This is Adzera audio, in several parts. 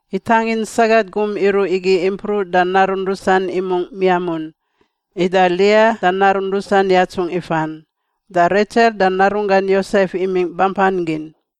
Itangin sagat gum iruꞌ igi impruꞌ da narun rusan imungꞌ miamun. Ida Lia da narun rusan yatsungꞌ ifan. Da Retsel da narunggan Yosef imingꞌ bampan gin.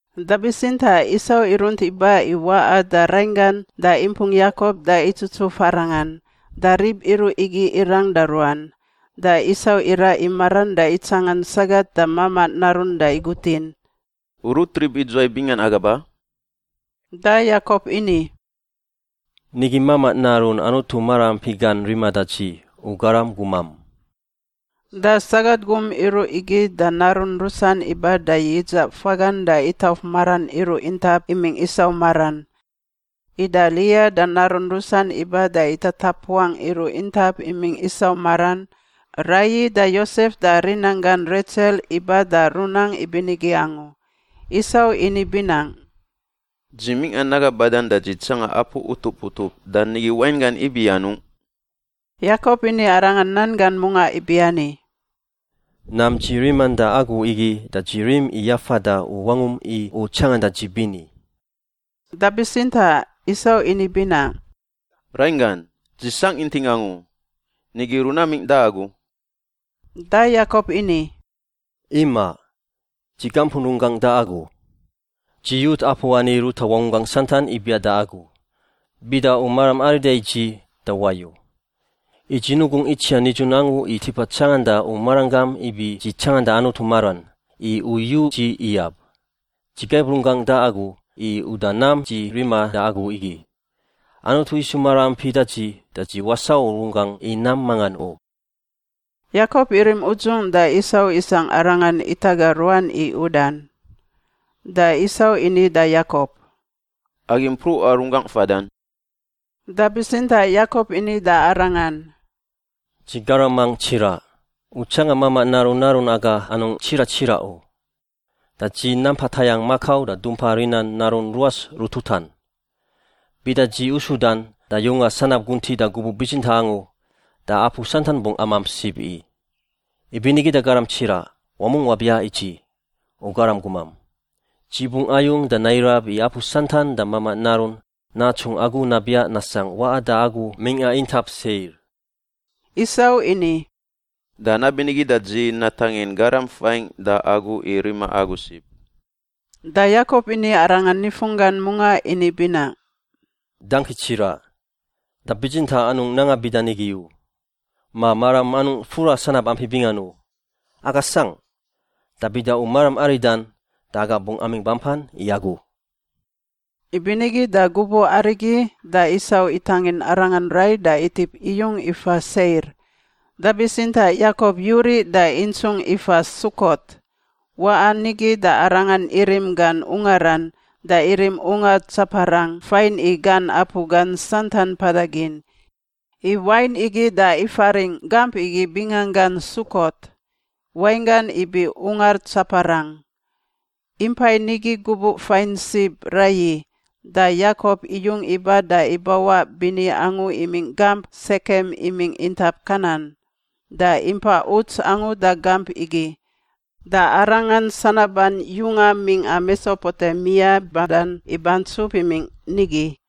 Da bitsintaꞌ Isau irunt iba i waꞌa da rainggan da impung Yakop da itsutsuf arangan. Da rib iruꞌ igi irang da ruan. Da Isau iraꞌ i maran da itsangan sagat da mamaꞌ narun da igutin, “U rut rib idzuwai bingan aga ba?” Da Yakop ini, “Nigi mamaꞌ narun Anutu maraampi gan riman da dzi, u garam gumam.” Da sagat gum iruꞌ igi da narun rusan iba da yidzaꞌ fagan da itauf maran iruꞌ intap imingꞌ Isau maran. Ida Lia da narun rusan iba da itatapuangꞌ iruꞌ intap imingꞌ Isau maran. Raiyi da Yosef da rinanggan Retsel iba da runang ibinigi angu. Isau ini binaꞌ, “Dzi mingꞌa naga badan da dzi tsanga apu utup utup, da nigi wainggan ibi anungꞌ?” Yakop ini arangan nan gan mungaꞌ ibiani, “Nam dzi riman da agu igi da dzi rim i yafada u wangum i u tsanganda dzi bini.” Da bitsintaꞌ Isau ini binaꞌ, “Rainggan, dzi sangꞌ inting angu. Nigi runamingꞌ da agu.” Da Yakop ini, “Imaꞌ. Dzi gampun runggangꞌ da agu. Dzi yut apu ani ruta wangunggangꞌ santan ibiaꞌ da agu. Bida u maram arida i dzi da wayu. I dzi nugungꞌ itsiaꞌ nidzun angu i tipa tsanganda u maranggam ibi dzi tsanganda Anutu maran, i u yu dzi iyab. Dzi gaib runggangꞌ da agu i uda nam dzi riman da agu igi. Anutu isu maraampi da dzi, da dzi wasau runggangꞌ i nam mangan u.” Yakop irim udzung da Isau isangꞌ arangan itaga ruan i udan. Da Isau ini da Yakop, “Agi mpruꞌa runggangꞌ fadan.” Da bitsintaꞌ Yakop ini da arangan, “Dzi garamang tsiraꞌ, u tsangan mamaꞌ narun narun aga anungꞌ tsiraꞌ tsiraꞌ u. Da dzi nampa tayangꞌ makau da dumpa rinan narun ruas rututan. Bida dzi usudan da yunga sanab guntiꞌ da gubuꞌ bitsintaꞌ angu da apu santan bungꞌ amamp sib i. Ibinigi da garam tsiraꞌ, wamungꞌ wabiaꞌ i dzi, u garam gumam. Dzi bungꞌ ayung da nairab i apu santan da mamaꞌ narun natsungꞌ agu nabiaꞌ nasangꞌ waꞌa da agu mingꞌa intap Seir.” Isau ini, “Da nabinigi da dzi natangin garam fain da agu i rima agu sib.” Da Yakop ini arangan nifunggan mungaꞌ ini binaꞌ, “Dangki tsiraꞌ. Da bitsintaꞌ anungꞌ nanga bida nigi u. Ma maram anungꞌ fura sanab ampi bingan u. Aga sangꞌ. Da bida u maram aridan da aga bungꞌ amingꞌ bampan i agu.” Ibinigi da gubuꞌ arigi da Isau itangin arangan rai da itip iyung ifa Seir. Da bitsintaꞌ Yakop yuriꞌ da intsungꞌ ifa Sukot. Waꞌan nigi da arangan irim gan ungaran, da irim ungar tsaparang fain i gan apu gan santan mpadan gin. I wain igi da ifaringꞌ gamp igi binganggan Sukot, wainggan ibi ungar tsaparang. Impai nigi gubuꞌ fain sib raiyi, da Yakop iyung iba da ibawaꞌ bini angu imingꞌ gamp Sekem imingꞌ intap Kanan, da impa uts angu da gamp igi. Da arangan sanaban yunga mingꞌa Mesopotemia badan ibantsup imingꞌ nigi.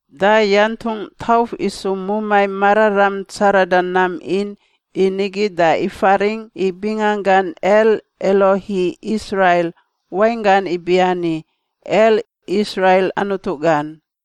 Da yantungꞌ tauf isu mumai mararam tsarada nam in i nigi da ifaringꞌ i binganggan El-Elohi-Israil, wainggan ibiani El, Israil Anutu gan.